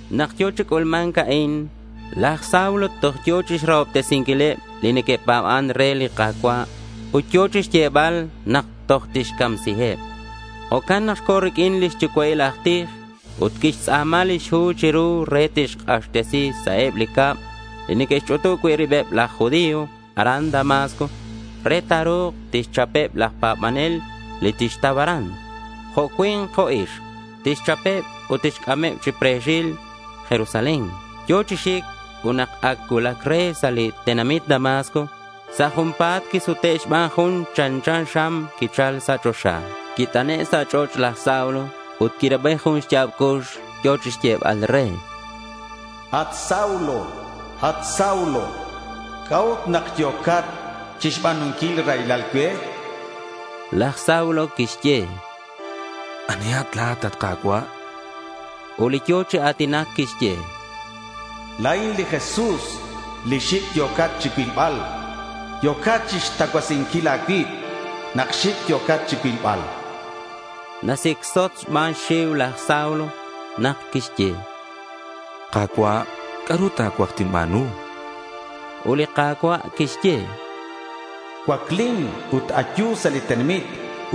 Nak yo̱ chi c'ulma̱nc a'in, laj Saulo toj yo̱ chixrahobtesinquileb li neque'pa̱ban re li Ka̱cua' ut yo̱ chixyebal nak toj tixcamsiheb. Jo'can nak co̱ riq'uin li xyucua'il aj tij. Ut quixtz'a̱ma lix hu chiru re tixk'axtesi sa' eb li cab li neque'xch'utub cui' ribeb laj judío aran Damasco re ta̱ru̱k tixchapeb laj pa̱banel li tixtau aran, jo' cui̱nk jo' ixk. Tixchapeb ut tixc'ameb chi pre̱xil Jerusalén. Yo̱ chi xic ut nak ac cuulac re sa' li tenamit Damasco, sa' junpa̱t quisute' xban jun chanchan xam quichal sa' choxa. Quit'ane' sa' ch'och' laj Saulo ut quirabi jun xya̱b cux yo̱ chixyebal re: —At Saulo, at Saulo, ¿C'a'ut nak yo̱cat chixba̱nunquil raylal cue?— Laj Saulo quixye: —¿Anihat la̱at, at Ka̱cua'?— Ut li yo̱ chi a̱tinac quixye: —La̱in li Jesús li xic' yo̱cat chirilbal. Yo̱cat chixtacuasinquil a̱cuib nak xic' yo̱cat chicuilbal, chan. Nasicsot xban xxiu laj Saulo nak quixye: —Ka̱cua', ¿c'a'ru ta̱cuaj tinba̱nu? chan. Ut li Ka̱cua' quixye: —Cuaclin ut ayu sa' li tenamit,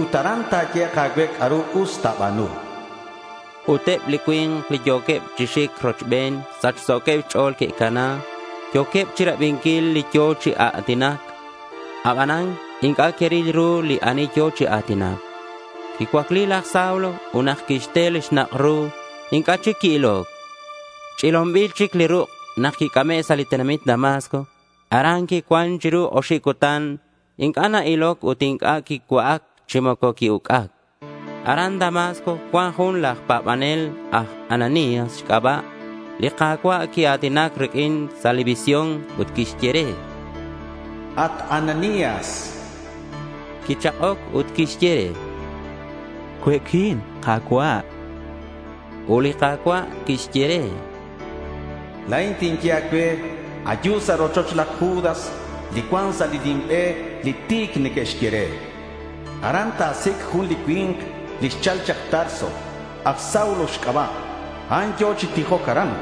ut aran ta̱yehek' a̱cue c'a'ru us ta̱ba̱nu, chan. Ut eb li cui̱nk li yo̱queb chi xic rochben sachso̱queb xch'o̱l que'cana. Yo̱queb chirabinquil li yo̱ chi a̱tinac, abanan inc'a' que'ril ru li ani yo̱ chi a̱tinac. Quicuacli laj Saulo ut nak quixte li xnak' ru, inc'a' chic qui-iloc. Ch'ilonbil chi ruk' nak quic'ame' sa' li tenamit Damasco. Aran quicuan chiru oxib cutan. Inc'a' na-iloc ut inc'a' quicua'ac chi moco qui-uc'ac. Aran Damasco cuan jun laj pa̱banel aj Ananías xc'aba'. Li Ka̱cua' quia̱tinac riq'uin sa' visión ut quixye re: —At Ananías.— Quichak'oc ut quixye re: —Cue'quin, Ka̱cua'.— Ut li Ka̱cua' quixye re: —La̱in tinye a̱cue, ayu sa' rochoch laj Judas li cuan sa' li nim be li Ti̱c neque'xye re. Aran ta̱sic' jun li cui̱nk li xchal chak Tarso. Aj Saulo xc'aba'. A'an yo̱ chi tijoc aran.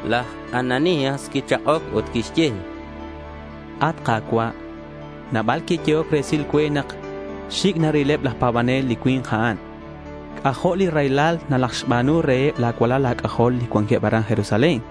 Laj Ananías quichak'oc ut quixye: —At Ka̱cua', nabal que'yehoc resil cue nak xic' narileb laj pa̱banel li cui̱nk a'an. C'ajo' li raylal nalajxba̱nu reheb la̱ cualal a̱c'ajol li cuanqueb aran Jerusalén.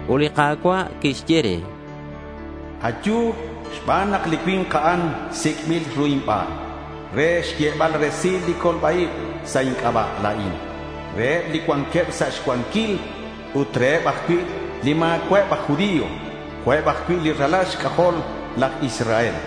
Ut li Ka̱cua' quixye re: —Ayu xban nak li cui̱nk a'an sic'bil ru inban re xyebal resil li colba-ib sa' inc'aba' la̱in reheb li cuanqueb sa' xcuanquil ut reheb ajcui' li ma̱cua'eb aj judío jo'queb ajcui' li ralal xc'ajol laj Israel.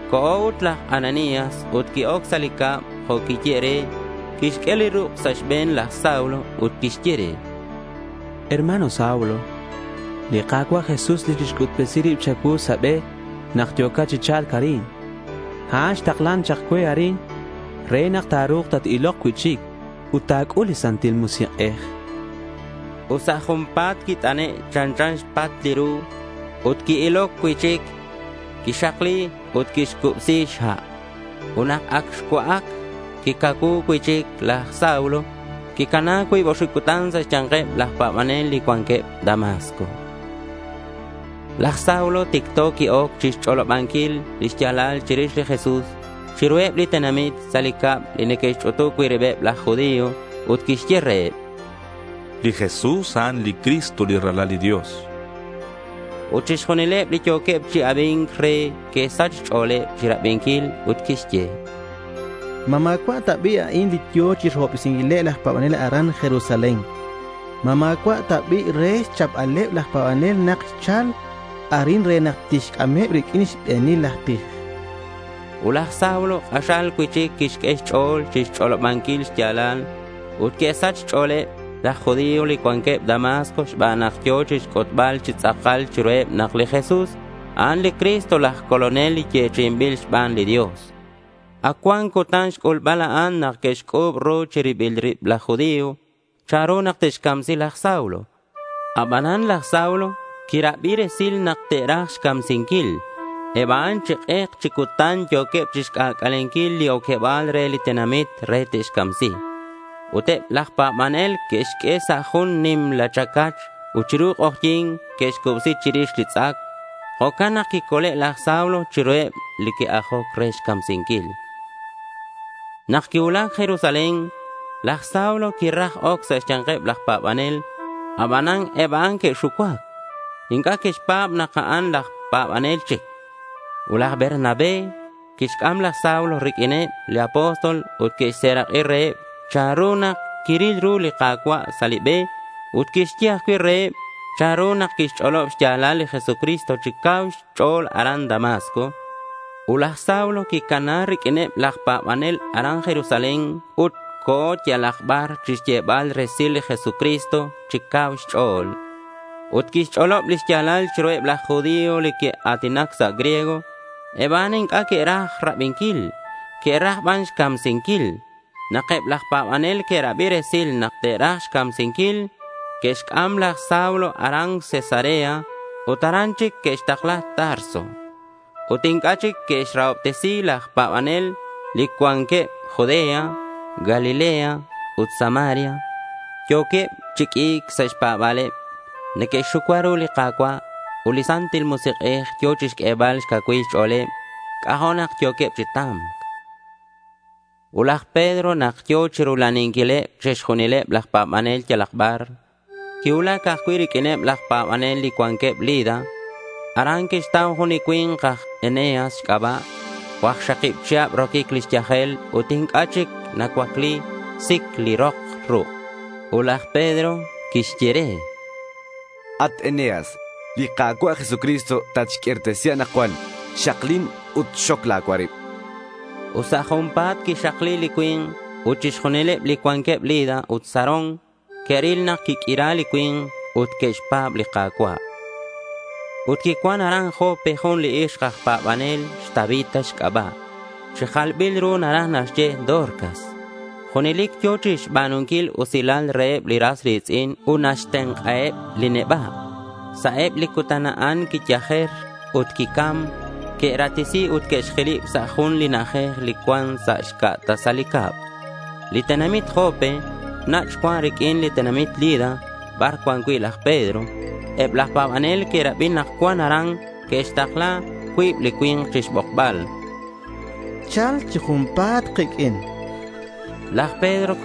Co̱ ut laj Ananías ut qui-oc sa' li cab jo' quiyehe' re. Quixq'ue li ruk' sa' xbe̱n laj Saulo ut quixye re: —Hermano Saulo, li Ka̱cua' Jesús, li quixc'utbesi rib cha̱cuu sa' li be nak yo̱cat chi cha̱lc arin, a'an xtaklan chak cue arin re nak ta̱ru̱k tat-ilok cui'chic ut ta̱c'ul li Santil Musik'ej, chan laj Ananías re. Ut sa' junpa̱t quit'ane' chanchan xpat li ru ut qui-iloc cui'chic. Quixakli ut quicubsi̱c xha'. Ut nak ac xcua'ac, quicacuu cui'chic. Laj Saulo quicana cuib oxib cutan sa' xya̱nkeb laj pa̱banel li cuanqueb Damasco. Laj Saulo ticto qui-oc chixch'olobanquil li xya̱lal chirix li Jesús, chiruheb li tenamit sa' eb li cab li neque'xch'utub cui' ribeb laj judío ut quixye reheb: —Li Jesús, a'an li Cristo li Ralal li Dios, chan. Ut chixjunileb li yo̱queb chi abi̱nc re que'sach xch'o̱leb chirabinquil ut que'xye: —¿Ma ma̱cua' ta bi' a'an li yo̱ chi rahobtesi̱nc reheb laj pa̱banel aran Jerusalén? ¿Ma ma̱cua' ta bi' re xchapbaleb laj pa̱banel nak xchal arin re nak tixc'ameb riq'uineb li xbe̱nil aj tij? chanqueb. Ut laj Saulo k'axal cui'chic quixq'ue xch'o̱l chixch'olobanquil xya̱lal ut que'sach xch'o̱leb laj judío li cuanqueb Damasco xban nak yo̱ chixc'utbal chi tz'akal chiruheb nak li Jesús a'an li Cristo laj Colonel li yechi'inbil xban li Dios. Ac cuan cutan xc'ulbal a'an nak que'xc'u̱b ru chi ribileb rib laj judío chanru nak te'xcamsi laj Saulo. Abanan laj Saulo quirabi resil nak te'raj xcamsinquil. Eb a'an chi k'ek chi cutan yo̱queb chixc'ac'alenquil li oqueba̱l re li tenamit re te'xcamsi. Ut eb laj pa̱banel que'xq'ue sa' jun nimla chacach ut chiru k'ojyi̱n que'xcubsi chirix li tz'ac. Jo'can nak quicole' laj Saulo chiruheb li que'ajoc re xcamsinquil. Nak quicuulac Jerusalén, laj Saulo quiraj oc sa' xya̱nkeb laj pa̱banel. Abanan eb a'an que'xucuac. Inc'a' que'xpa̱b nak a'an aj pa̱banel chic. Ut laj Bernabé quixc'am laj Saulo riq'uineb li apóstol ut quixserak'i reheb chanru nak quiril ru li Ka̱cua' sa' li be ut quixye ajcui' reheb chanru nak quixch'olob xya̱lal li Jesucristo chi cau xch'o̱l aran Damasco. Ut laj Saulo quicana riq'uineb laj pa̱banel aran Jerusalén ut co̱ yalak bar chixyebal resil li Jesucristo chi cau xch'o̱l. Ut quixch'olob li xya̱lal chiruheb laj judío li neque'a̱tinac sa' griego. Eb a'an inc'a' que'raj rabinquil. Que'raj ban xcamsinquil. Nak eb laj pa̱banel que'rabi resil nak te'raj xcamsinquil, que'xc'am laj Saulo aran Cesarea ut aran chic que'xtakla Tarso. Ut inc'a' chic que'rahobtesi̱c laj pa̱banel li cuanqueb Judea, Galilea, ut Samaria. Yo̱queb chi q'ui̱c sa' xpa̱ba̱leb. Neque'xxucua ru li Ka̱cua'. Ut li Santil Musik'ej yo̱ chixq'uebal xcacuilal xch'o̱leb. C'ajo' nak yo̱queb chi ta̱mc. Ut laj Pedro, nak yo̱ chirula'aninquileb chixjunileb laj pa̱banel yalak bar, quicuulac ajcui' riq'uineb laj pa̱banel li cuanqueb Lida. Aran quixtau jun li cui̱nk aj Eneas xc'aba'. Cuakxakib chihab roquic lix yajel ut inc'a' chic nacuacli. Sic li rok ruk'. Ut laj Pedro quixye re: —At Eneas, li Ka̱cua' Jesucristo tatxq'uirtesi anakcuan. Xaklin ut xoc la̱ cuarib, chan. Ut sa' junpa̱t quixakli li cui̱nk. Ut chixjunileb li cuanqueb Lida ut Sarón que'ril nak quiq'uira li cui̱nk ut que'xpa̱b li Ka̱cua'. Ut quicuan aran Jope jun li ixk aj pa̱banel xTabita xc'aba'. Chi jalbil ru naraj naxye Dorcas. Junelic yo̱ chixba̱nunquil usilal reheb li ras ri̱tz'in ut naxtenk'aheb li neba'. Sa' eb li cutan a'an quiyajer ut quicam. Que'ratesi ut que'xjilib sa' jun li na'ajej li cuan sa xca' tasal li cab. Li tenamit Jope nach' cuan riq'uin li tenamit Lida bar cuan cui' laj Pedro. Eb laj pa̱banel que'rabi nak cuan aran. Que'xtakla cuib li cui̱nk chixbokbal. —Cha̱lkat chi junpa̱t kiq'uin, chanqueb re laj Pedro.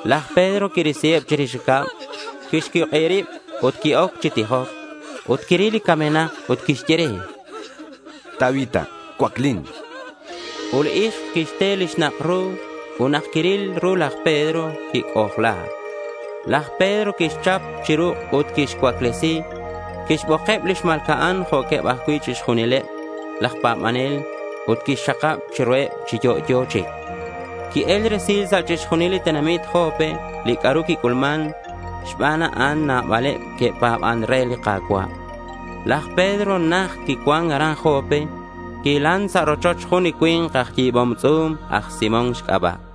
Laj Pedro quirisiheb chirix cab. Quixcuik'ib rib ut qui-oc chi tijoc. Ut quiril li camenak ut quixye re: —Tabita, cuaclin, chan. Ut li ixk quixte li xnak' ru, ut nak quiril ru laj Pedro, quic'ojla. Laj Pedro quixchap chi ruk' ut quixcuaclesi. Quixbokeb li xma̱lca'an jo' ajcui' chixjunileb laj pa̱banel ut quixxakab chiruheb chi yo'yo chic. Qui-el resil sa' chixjunil li tenamit Jope li c'a'ru quic'ulman. Xban a'an nabaleb que'pa̱ban re li Ka̱cua'. Laj Pedro najt quicuan aran Jope. Quihilan sa' rochoch jun li cui̱nk aj yi̱bom tz'u̱m, aj Simón xc'aba'.